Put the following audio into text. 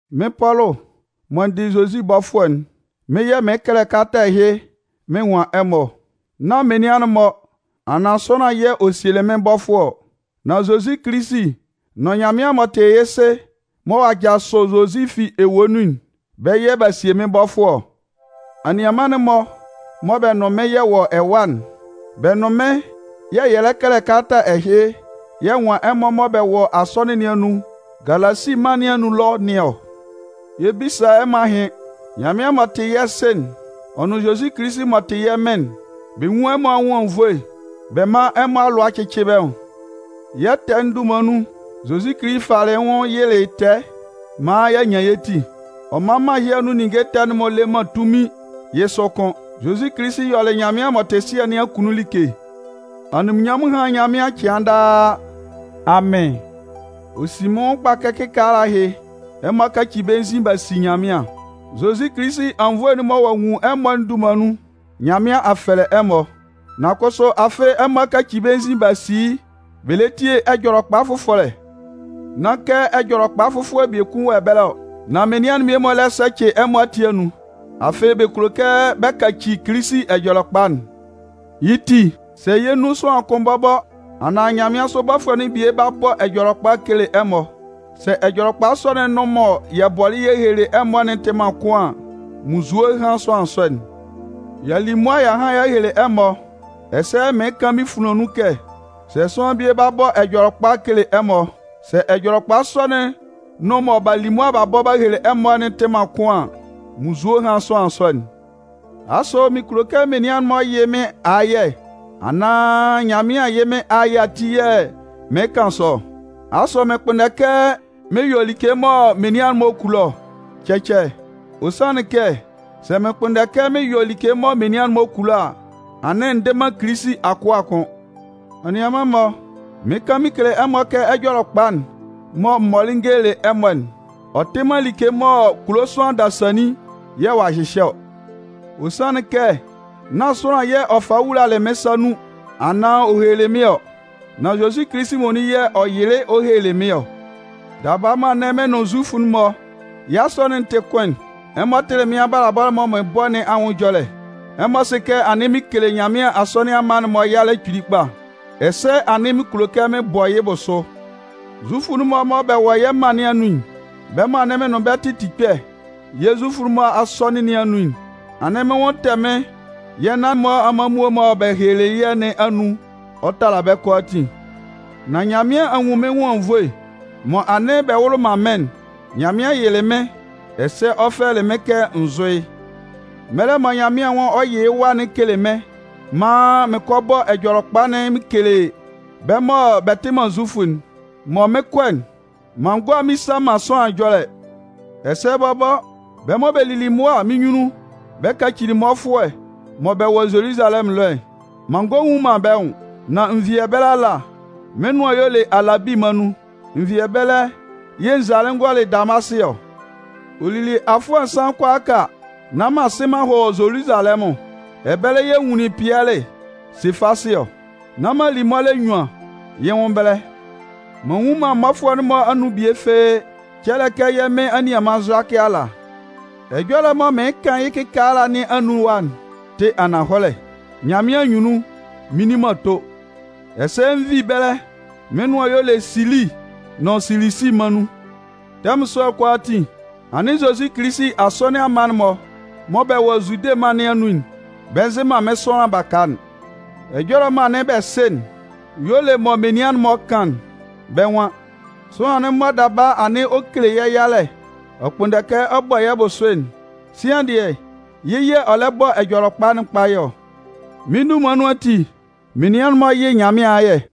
Mɩ́n Pɔlʋ mɔ n dɩ Zozi bɔfʋɛ'n, mɩ́n yɛ̂ mɩɩn kɛlɛ kalata ɛhɩ mɩn nwan ɛmɔ ɔ. Nán menian'n-mɔ anaan sʋanlan yɛ̂ ɔ sielɩ mɩ́n bɔfʋɛ ɔ. Nan Zozi Kilisi nʋn Nyanmɩan m'ɔ tɩ yɛ́ Sɩ mɔ ɔ'a jasʋ Zozi fi ewue nun'n, bɛ́ yɛ̂ b'a sie mɩ́n bɔfʋɛ ɔ. Anianman'n-mɔ mɔ bɛ nʋn mɩ́n yɛ wɔ ɛwa'n, bɛ nʋn mɩ́n yɛ̂ yɛ lɛ kɛlɛ kalata ɛhɩ yɛ nwan ɛmɔ mɔ bɛ wɔ asɔnɩn nɩn anun Galasi mân nɩn anun ɛlɔ nɩn ɔ. Yɛ 'bisa ɛmɔ ahɩn. Nyanmɩan m'ɔ tɩ yɛ́ Sɩ'n, ɔ nʋn Zozi Kilisi m'ɔ tɩ yɛ́ Mɩn'n, bɛ nwún ɛmɔ anwʋn anwunnvoe bɛ mán ɛmɔ alʋa cɩ́cɩ bɛ́ nwʋn. Yɛ́ ɛtɛ'n dunman nun, Zozi Kilisi falɩ yɩ́ nwʋn yɩlɩ tɛɛ maan y'a nyan yɛ́ ti. Ɔ man mân ɛhɩ anun ninnge ɛtɛ'n-mɔ le man tunmin yɛ́ sʋ kʋ́n. Zozi Kilisi yɔlɩ Nyanmɩan m'ɔ tɩ Sɩɛ nɩn akunnun like. Anunminnyanmʋn hán Nyanmɩan cɩan daa! Amɩn! Ɔ sin mɩ́n nwʋn kpa kɛ kɩkaala ɛhɩ, ɛmɔ a kaci bɛ́ nzin b'a si Nyanmɩan. Zozi Kilisi anwunnvoe'n mɔ ɔ'a nwun ɛmɔ'n dunman nun, Nyanmɩan a fɛlɛ ɛmɔ. Nan kʋsʋ afɩ ɛmɔ a kaci bɛ́ nzin b'a si yɩ́ bɛ lɛ tie ɛjɔlɛkpa fʋfɔlɛ. Nán kɛ ɛjɔlɛkpa fʋfɔlɛ biekun wɔ ɛbɛlɛ ɔ. Nan menian mmie-mɔ lɛ sɛcɩ ɛmɔ ati anun. Afɩ bɛ kulo kɛ bɛ kaci Kilisi Ɛjɔlɛkpa'n. Yɩ́ ti, sɛ yɛ́ nun sʋanlan kʋn bɔbɔ, anaan nyanmɩansʋ bɔfʋɛ'n bie ba bɔ ɛjɔlɛkpa kele ɛmɔ, sɛ ɛjɔlɛkpa sɔ'n nʋn mɔ yɛ bɔlɩ yɛ helelɩ ɛmɔ'n tɩ man kʋn an, munnzue hán sʋanlan sɔ'n! Y'a li mʋa y'a han y'a hele ɛmɔ, ɛsɛ mɩɩn kan mɩ́n funlan nun kɛ, sɛ sʋanlan bie ba bɔ ɛjɔlɛkpa kele ɛmɔ, sɛ ɛjɔlɛkpa sɔ'n nʋn mɔ b'a li mʋa ba bɔ ba hele ɛmɔ'n tɩ man kʋn an, munnzue hán sʋanlan sɔ'n. Asʋ mɩn kulo kɛ menian'n-mɔ yɩ mɩ́n ayɛ anaan Nyanmɩan yɩ́ mɩ́n ayɛ ati yɛ̂ mɩɩn kan sɔ ɔ? Asʋ mɩn kpʋnndɛ kɛ mɩn yɔ like mɔ menian'n-mɔ kulo ɔ? Cɛcɛ, ɔ sanlɩn kɛ sɛ mɩn kpʋnndɛ kɛ mɩn yɔ like mɔ menian'n-mɔ kulo a, anɩn n dɩ man Kilisi akʋa kʋ́n. Anianman-mɔ, mɩɩn kan mɩn kele ɛmɔ kɛ Ɛjɔlɛkpa'n mɔ m mɔlɩ n gelelɩ ɛmɔ'n, ɔ tɩ man like mɔ kulo sʋanlan dasannin yɛ̂ ɔ'a hyɩhyɛ ɔ. Ɔ sanlɩn kɛ, nán sʋanlan yɛ̂ ɔ falɩ wulalɩ mɩ́n sa nun anaan ɔ hehelelɩ mɩ́n ɔ. Nan Zozi Kilisi muonun yɛ̂ ɔ yɩlɩ ɔ helelɩ mɩ́n ɔ. Daba mɔ anɩn mɩn nʋn Zufʋ'n-mɔ yɛ́ asɔnɩn'n tɩ kʋn'n, ɛmɔ tɩlɩ mɩ́n abalabɔ mɔ mɩn bɔ nɩn anwʋn ɛjɔlɛ. Ɛmɔ sɩ kɛ anɩn mɩn kele Nyanmɩan asɔnɩn mma'n-mɔ yalɛ kpili kpa. Ɛsɛ anɩn mɩn kulo kɛ mɩn bɔ yɩ́ bʋsʋ. Zufʋ'n-mɔ mɔ bɛ wɔ yɛ́ mân nɩn anun'n, bɛ́ mɔ mɩn nʋn bɛ́ yɛ tɩ tikpɛ yɛ́ Zufʋ asɔnɩn nɩn anun'n, anɩn mɩ́n nwʋn tɛ mɩ́n yɛ́ nan-mɔ amanmuo mɔ bɛ helelɩ yɛ́ nɩn anun ɔ tala bɛ́ kʋalaatin. Nan Nyanmɩan a nwun mɩ́n nwʋn anwunnvoe. Mɔ anɩn bɛ wʋlɩ man mɩ́n'n, Nyanmɩan yɩlɩ mɩ́n ɛsɛ ɔ fɛlɛlɩ mɩ́n kɛ n zʋ́ yɩ́. Mɛlɛ mɔ Nyanmɩan nwan ɔ 'yɩ yɩ́ Wa'n kele mɩ́n, maan mɩn kɔ bɔ Ɛjɔlɛkpa'n mɩn kele bɛ́ mɔ bɛ tɩ man Zufʋ'n, mɔ mɩn 'kɔ'n, m'an gɔ a mmisa man sʋanlan ɛjɔlɛ. Ɛsɛ bɔbɔ, bɛ́ mɔ bɛ lili mʋa mɩ́n nyunnun bɛ kacili mmɔfʋɛ mɔ bɛ wɔ Zoluzalɛmʋn ɛlɔ'n, m'an ngɔ a nnwun man bɛ́ nwʋn. Nan n vi ɛbɛlɛ ala, mɩ́n nʋan y'ɔ le Alabi mân nun. N vi ɛbɛlɛ yɛ̂ n zalɩ n gɔlɩ Damasɩ ɔ. Ɔ lili afʋɛ nsan kʋalaaka nán m'an sɩn m'an hɔ Zoluzalɛmʋn. Ɛbɛlɛ yɛ̂ n nwunlin Pɩɛlɩ (Sefasɩ) ɔ, nán m'an li mɔlɛ nnyuan yɩ́ nwʋn ɛbɛlɛ. M'an nnwun man mmɔfʋɛ'n-mɔ anun bie fɩ́ɩ́, cɛlɛ kɛ yɛ́ Mɩn anianman Zʋakɩ ala. Ɛjɔlɛ'n mɔ mɩɩn kan yɩ́ kalata nɩn anun ɛwa'n tɩ ananhɔlɛ, Nyanmɩan anyunnun mɩ́n nni man ato. Ɛsɛ n vi ɛbɛlɛ, mɩ́n nʋan y'ɔ le Sili nʋn Silisi mân nun. Tɛmʋn sɔ'n kʋalaatin, anɩn Zozi Kilisi asɔnɩn mma'n-mɔ mɔ bɛ wɔ Zude mân nɩn anun'n, bɛ nzɩ man mɩ́n sʋanlan baka'n. Ɛjɔlɛ mɔ anɩn bɛ sɩ'n y'ɔ le mɔ menian'n-mɔ kan'n. Bɛ́ nwan: “Sʋanlan'n mɔ daba anɩn ɔ kele yɛ́ yalɛ, ɔ kpʋnndɛ kɛ ɔ bɔ yɛ́ bʋsʋ'n, sian dɩɛ, yɩ́ yɛ̂ ɔ lɛ bɔ Ɛjɔlɛkpa'n kpayɛ ɔ.” Mɩ́n dunman nun ati, menian'n-mɔ yɩ Nyanmɩan ayɛ.